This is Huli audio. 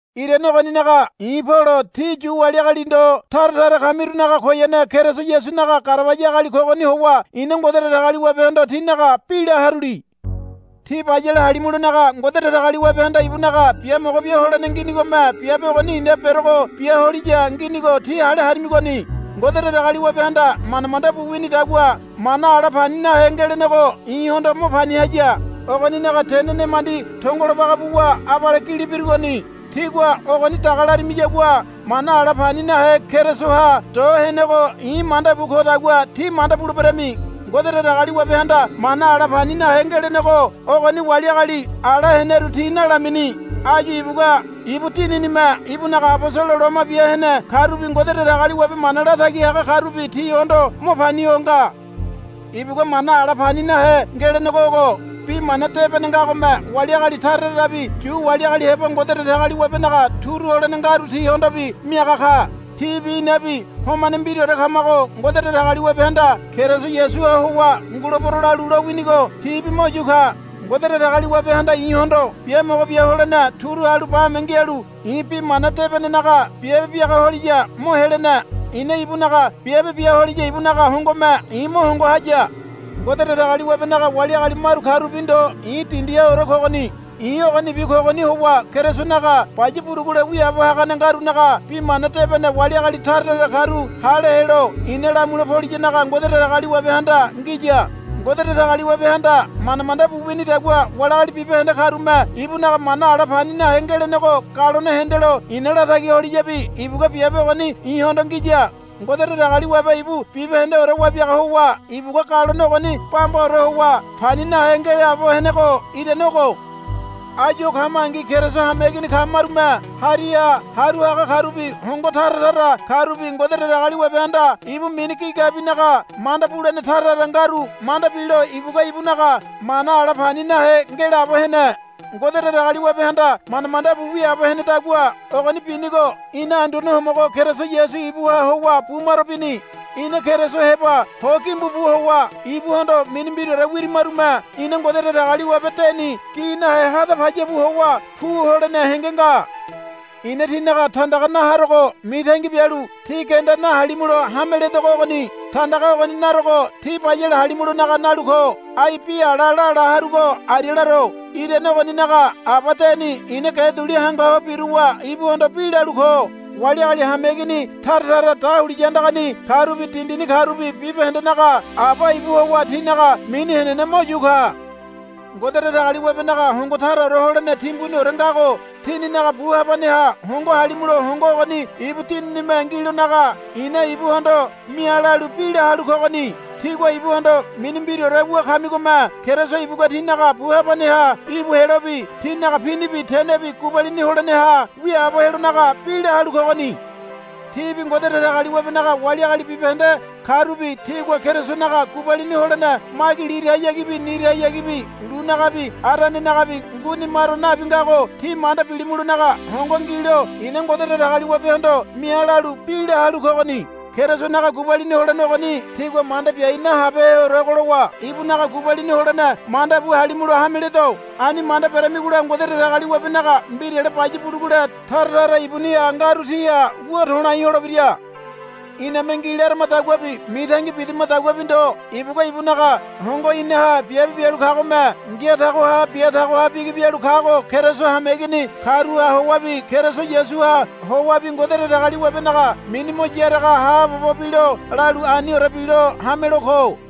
Irane ogoninaga i̱ Polo tí Yu wali agali ndo tara tara kamirunaga koyane Keriso Yasunaga garabaya agali kogoni howa i̱na Ngode Datagaliwabehondo tínaga bi la haruli. Tí bayale halimulonaga Ngode Datagaliwabehanda ibunaga biamogo bia holene nginigome biabe ogoni i̱na berogo bia holiya nginigo tí hale harimigoni. Ngode Datagaliwabehanda manda manda bu winidagua mana ala pani nahe ngelenego i̱hondo mo pani haya. Ogoninaga tene nemandi tongolo baga buwa abale gili birugoni. Tígua ogoni daga larimiyagua mana ala pani nahe Kerisoha do henego i̱ manda bu kodagua tí manda buleberami. Ngode Datagaliwabehanda mana ala pani nahe ngelenego ogoni wali agali ala heneru ti nalamini. Áyu ibugua ibu Dininime ibunaga abosolo loma bia hene karubi Ngode Datagaliwabe mana latagi haga karubi tihondo mo pani ho nga. Ibugua mana ala pani nahe ngelenego ogo. Bi mana debene ngagome wali agali tara tarabi Yu wali agali heba Ngode Datagaliwabenaga turu holene ngaru tihondobi miaga ka. Tibi inabi homane mbiraore kamago Ngode Datagaliwabehanda Keriso Yasuha howa, Ngulebero, lalu lowinigo tibi mo yu ka. Ngode Datagaliwabehanda i̱hondo biamogo bia holene turu halu bame ngialu i̱ bi mana debenenaga biabe biaga holiya mo helene. I̱na ibunaga biabe bia holiya ibunaga hongome i̱ mo hongo haya. Ngode Datagaliwabenaga wali agali maru karubi ndo i̱ dindihaore kogoni. I̱ ogonibi kogoni howa Kerisonaga baya burugule wiaabo hagane ngarunaga Bi Mana Debene wali agali tara tara karu hale helo i̱na lamule poliyanaga Ngode Datagaliwabehanda ngiya. Ngode Datagaliwabehanda manda manda bu winidagua wali agali bibahende karume ibunaga mana ala pani nahe ngelenego galone hendelo i̱na latagi holiyabi ibugua biabe ogoni i̱hondo ngiya. Ngode Datagaliwabe ibu bibahendeore wabiaga howa ibugua galone ogoni bambaore howa pani nahe ngelaabo henego irane ogo. Áyu o kamangi Keriso hameigini kamarume hariha haru haga karubi hongo tara tara karubi Ngode Datagaliwabehanda ibu mini gigabinaga manda bulene tara tara ngaru manda bilo ibugua ibunaga mana ala pani nahe ngelaabo hene. Ngode Datagaliwabehanda manda manda bu wiaabo henedagua ogoni binigo ina Anduane Homogo Keriso Yasu ibuha howa bumaro bini. Ina Keriso heba ho gimbu bu howa ibuhondo mini mbiraore wirimarume ina Ngode Datagaliwabe deni gi nahe hada payabu howa pu holene henge nga. I̱na tínaga tandaga na harogo mitangi bialu tí genda nahalimulo hame ledogo ogoni. Tandaga ogoni narogo tí bayale halimulonaga nalu ko. Ai bi ala lala harugo aria laro. Irane ogoninaga Aba deni i̱na ge duli hangu ho biruwa ibuhondo bi lalu ko. Wali agali hameigini tara tara dahuliya andagani karubi dindini karubi bibahendenaga Aba ibu howa tinaga mini henene mo yu ka. Ngode Datagaliwabenaga hongo taraore holene timbuniore ngago tíninaga bu habaneha hongo halimulo hongo ogoni ibu Dininime ngilonaga i̱na ibuhondo mia lalu bi la halu kogoni. Tígua ibuhondo mini mbiraore wu kamigome Keriso ibugua tínaga bu habaneha íbu helobi tínaga pinibi tenebi gubalini holeneha wiaabo helonaga bi la halu kogoni. Tíbi Ngode Datagaliwabenaga wali agali bibahende karubi tígua Kerisonaga gubalini holene magi lirahayagibi nirahayagibi lunagabi aranenagabi nguini maro nabi ngago tí manda bilimulonaga hongo ngilo i̱na Ngode Datagaliwabehondo mia lalu bi la halu kogoni. Kerisonaga gubalini holene ogoni tígua manda biai nahabeheorego lowa ibunaga gubalini holene manda bu halimulo hame ledo. Ani manda beramigola Ngode Datagaliwabenaga mbirale baya burugule tara tara ibuniha ngaru tíha wu to̱lai holebira. Iname ngi laramadaguabi mitangi bidamadaguabi ndo ibugua ibunaga hongo inaha biabe bialu kagome ngia tago ha bia tago ha bigi bialu kago Keriso hameigini karuha howabi Keriso Yasuha howabi Ngode Datagaliwabenaga mini mo yaraga haabobo bilo lalu aniore bilo hamelo ko.